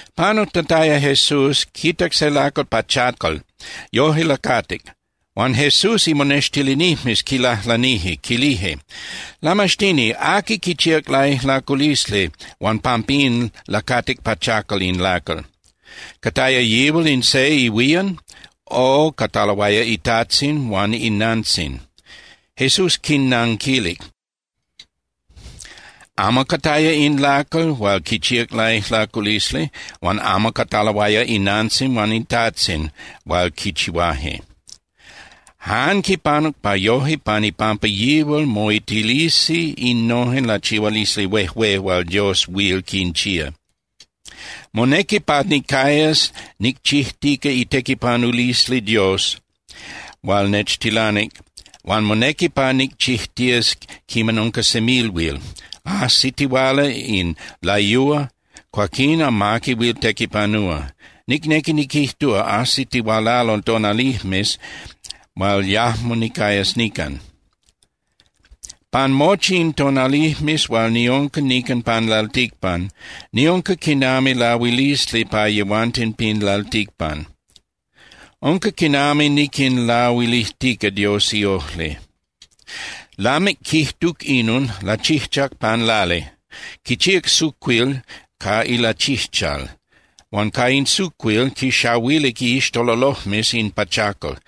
Panujtataya Jesús, quitac se lacal pachacal, yoje lacatic. Huan Jesús imonextilinijmes quilajlanije, quilije: —Lamaxtini, ¿aqui quichíac laijlaculisli huan pampín lacatic pachacal in lacal? ¿Cataya yihual in se ihuían, o cataloaya itajtzin huan inantzin? Jesús quinnanquilic: —Amo cataya in lacal hual quichíac laijlaculisli, huan amo cataloaya inantzin huan itajtzin hual quichihuaje. Jan quipanuc pa yoje pan ipampa yihual moitilisi innojen lachihualisli huejué hual Dios huil quinchía. Monequi pa nicayas nicchijtica itequipanulisli Dios hual nechtilanic huan monequi pa nicchijtías quiman unca semilhuil. Ajsitihuala in layúa, cuaquín amaqui huil tequipanúa. Nicnequi niquijtúa, ajsitihualalo tonalijmes hual yajmo nicayas nican. Pan mochi in tonalijmes hual niunca nican pan lalticpan, niunca quinami lahuilisli pa yehuanten pin lalticpan. Unca quinami niquinlahuilijtica Dios iojli. Lamic quijtuc inon, lachijchac pan lali, quichíac sucuil ca ilachijchal huan ca in sucuil quixahuilic iixtololojmes in pachacal.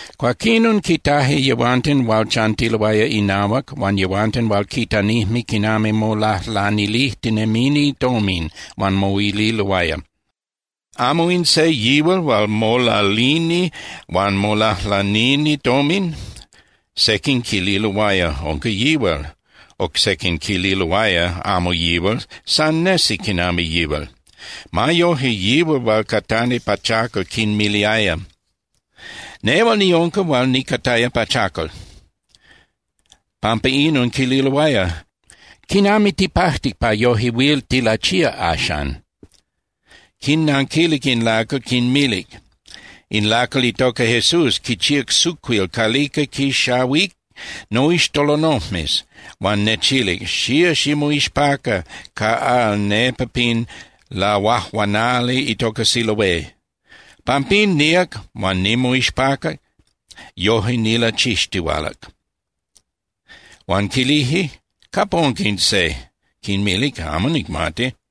Cuaquinon, quitaje yehuanten hual chantiloaya inahuac huan yehuanten hual quitanijme quinami molajlanilijtinemini tomin, huan moililoaya: —¿Amo in se yihual hual molalini huan molajlanini tomin? Sequin quililoaya: —Unca yihual. Oc sequin quililoaya: —Amo yihual, san nesi quinami yihual. Ma yoje, yihual hual catani pachacal quinmiliaya: —Nehual niunca hual nicataya pachacal. Pampa inon quililoaya: —¿Quinami tipajtic pa yoje huil tilachía axan? Quinnanquilic in lacal, quinmilic: —In lacal itoca Jesús quichíac sucuil calica quinxahuic noixtololojmes huan nechilic: “Xía ximoixpaca ca al nepa pin lahuajuanali itoca Siloé.” Pampín, níac huan nimoixpacac, yoje nilachixtihualac. Huan quilije: —¿Capa unca in se? Quinmilic: —Amo nicmati.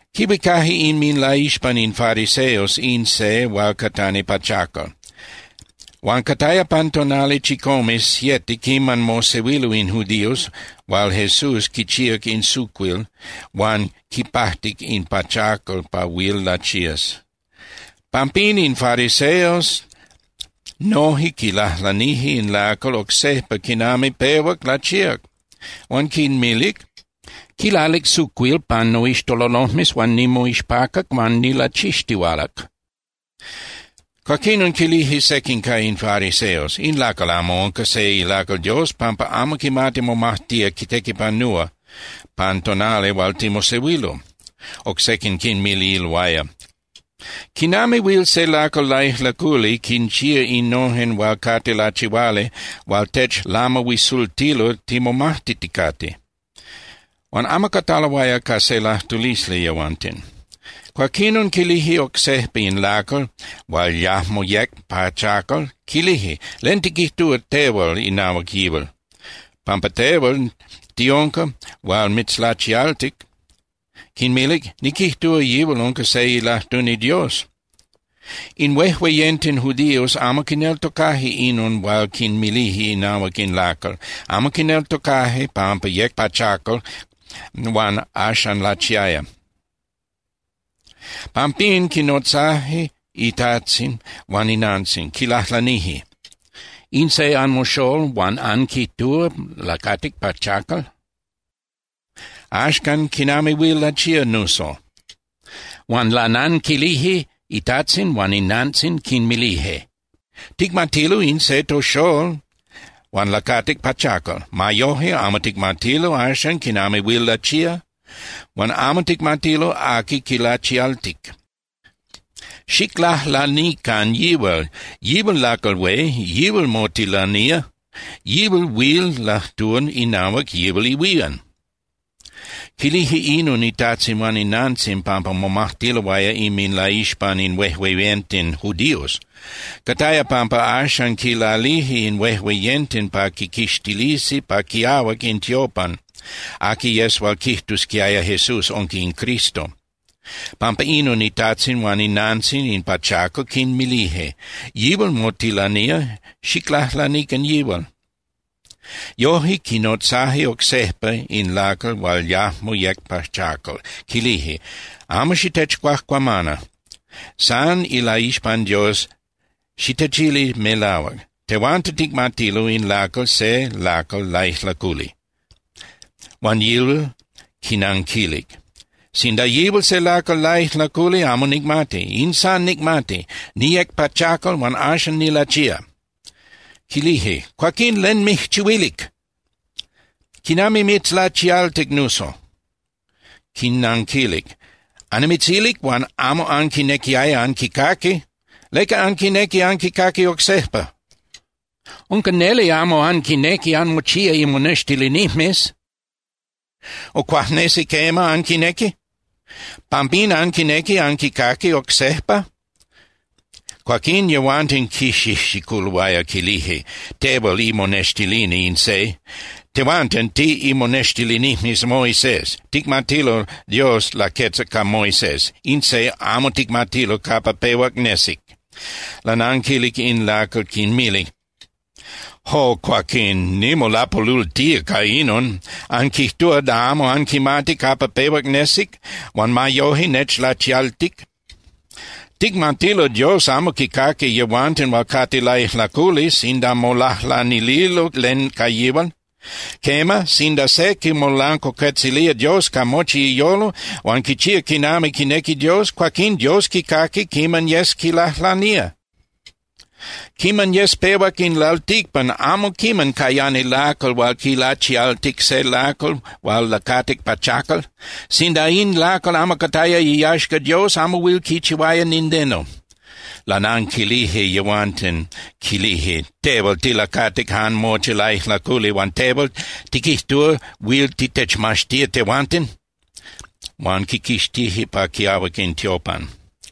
Quihuicaje inminlaixpan in fariseos in se hual catani pachacal. Huan cataya pan tonali chicome (siete) quiman mosehuilo in judíos hual Jesús quichíac in sucuil huan quipajtic in pachacal pa huil lachías. Pampín in fariseos noje quilajlanije in lacal oc sejpa quinami pehuac lachíac, huan quinmilic: —Quilalic sucuil pan noixtololojmes huan nimoixpacac huan nilachixtihualac. Cuaquinon quilije sequin ca in fariseos: —In lacal amo unca se ilacal Dios pampa amo quimati momajtía tequipanúa pan tonali hual timosehuilo. Oc sequin quinmililoaya: —¿Quinami huil se lacal laijlaculi quinchía innojen hual cate lachihuali hual techlamahuisultilo timomajtiticate? Huan amo cataloaya ca se lajtulisli yehuanten. Cuaquinon quilije oc sejpa in lacal hual yajmo yec pachacal, quilije: —¿Len tiquijtúa tehual inahuac yihual? Pampa tehual tiunca hual mitzlachialtic. Quinmilic: —Niquijtúa yihual unca se ilajtuni Dios. In huejueyenten judíos amo quineltocaje inon hual quinmilije inahuac in lacal, amo quineltocaje pampa yec pachacal huan axan lachiaya. Pampín, quinnotzajque itajtzin huan inantzin. Quinlajlanije: —¿In se anmoxól huan anquijtúa lacatic pachacal? Axcan, ¿quinami huil lachía nuso? Huan lananquilije itajtzin huan inantzin, quinmilije: —Ticmatilo in se toxól huan lacatic pachacal. Ma yoje, amo ticmatilo axan quinami huil lachía, huan amo ticmatilo aqui quilachialtic. Xiclajlanican yihual, yihual lacal hué, yíal motilanía, yihual huil lajtúa inahuac yihual ihuían. Quilije inon itajtzin huan inantzin pampa momajtiloaya inminlaixpan in huejueyenten judíos. Cataya pampa axan quilalije in huejueyenten pa quiquixtilisi pa quiahuac in tiopan aqui yes hual quijtusquiaya Jesús unca in Cristo. Pampa inon itajtzin huan inantzin in pachacal quinmilije: “Yihual motilanía, xiclajlanican yihual.” Yoje, quinotzaje oc sejpa in lacal hual yajmo yec pachacal, quilije: —Amo xitechcuajcuamana, san ilaixpan Dios xitechili melahuac. Tehuanten ticmatilo in lacal se lacal laijlaculi. Huan yihual quinnanquilic: —Sinda yihual se lacal laijlaculi, amo nicmati. In san nicmati: Niyec pachacal huan axan nilachía. Quilije: —Cuaquín ¿len mijchihuilic? ¿Quinami mitzlachialtic nuso? Quinnanquilic: —Annimitzilic huan amo anquinequiaya anquicaqui. ¿Leca anquinequi anquicaqui oc sejpa? Unca neli amo anquinequi anmochía imonextilinijmes. O ¿cuajnesi quema anquinequi? ¿Pampín anquinequi anquicaqui oc sejpa? Cuaquín yehuanten quixijxiculoaya, quilije: —Tehual imonextilini in se. Tehuanten tiꞌimonextilinijmes Moisés. Ticmatilo Dios laquetzac ca Moisés. In se amo ticmatilo capa pehuac nesic. Lananquilic in lacal, quinmilic: —¡Jo, cuaquín, nimolapolultía ca inon! ¡Anquijtúa da amo anquimati capa pehuac nesic huan ma yoje nechlachialtic! Ticmatilo Dios amo quicaqui yehuanten hual cate laijlaculi sinda molajlanililo len ca yihual. Quema, sinda se quimolancuacuetzilía Dios ca mochi iyolo huan quichía quinami quinequi Dios, cuaquín Dios quicaqui quiman yes quilajlanía. Quiman yes pehuac in lalticpan amo quiman cayani lacal hual quilachialtic se lacal hual lacatic pachacal. Sinda in lacal amo cataya iyaxca Dios, amo huil quichihuaya nindeno. Lananquilije yehuanten, quilije: —Tehual tilacatic jan mochi laijlaculi. Huan tehual ¿tiquijtúa huil titechmaxtía tehuanten? Huan quiquixtije pa quiahuac in tiopan.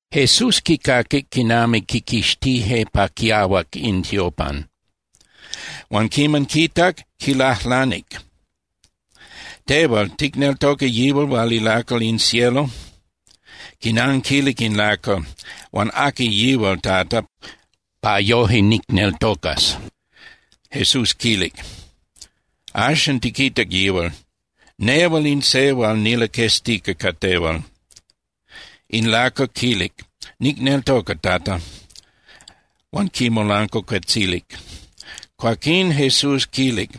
Jesús quicaquic quinami quiquixtije pa quiahuac in tiopan, huan quiman quitac, quilajlanic: —Tehual, ¿ticneltoca yihual hual ilacal in cielo? Quinanquilic in lacal: —Huan ¿aqui yihual, Tata, pa yoje nicneltocas? Jesús quilic: —Axan tiquitac yihual. Nehual in se hual nilaqueztica ca tehual. In lacal quilic: —Nicneltoca, Tata. Huan quimolancuacuetzilic. Cuaquín Jesús quilic: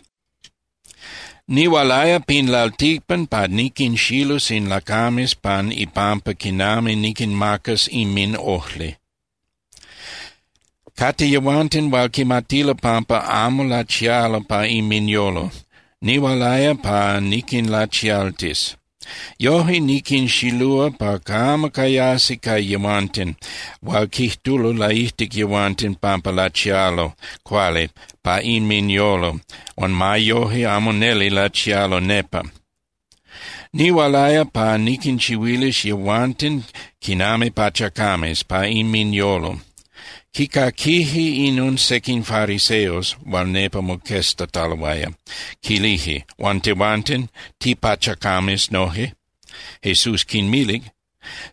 —Nihualaya pin lalticpan pa niquinxilus in lacames pan ipampa quinami niquinmacas inminojli. Cate yehuanten hual quimatilo pampa amo lachialo pa inminyolo. Nihualaya pa niquinlachialtis. Yoje niquinxilúa pa camo cayasi ca yehuanten hual quijtulo laijtic yehuanten pampa lachialo cuali pa inminyolo huan ma yoje amo neli lachialo nepa. Nihualaya pa niquinchihuilis yehuanten quinami pachacames pa inminyolo. Quicaquije inon sequin fariseos hual nepa moqueztataloaya, quilije: —Huan tehuanten, ¿tipachacames noje? Jesús quinmilic: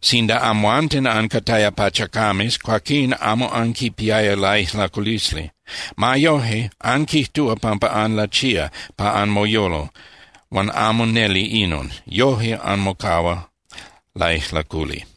—Sinda amhuanten ancataya pachacames, cuaquín amo anquipiaya laijlaculisli. Ma yoje, anquijtúa pampa anlachía pa anmoyolo huan amo neli inon. Yoje anmocahua laijlaculi.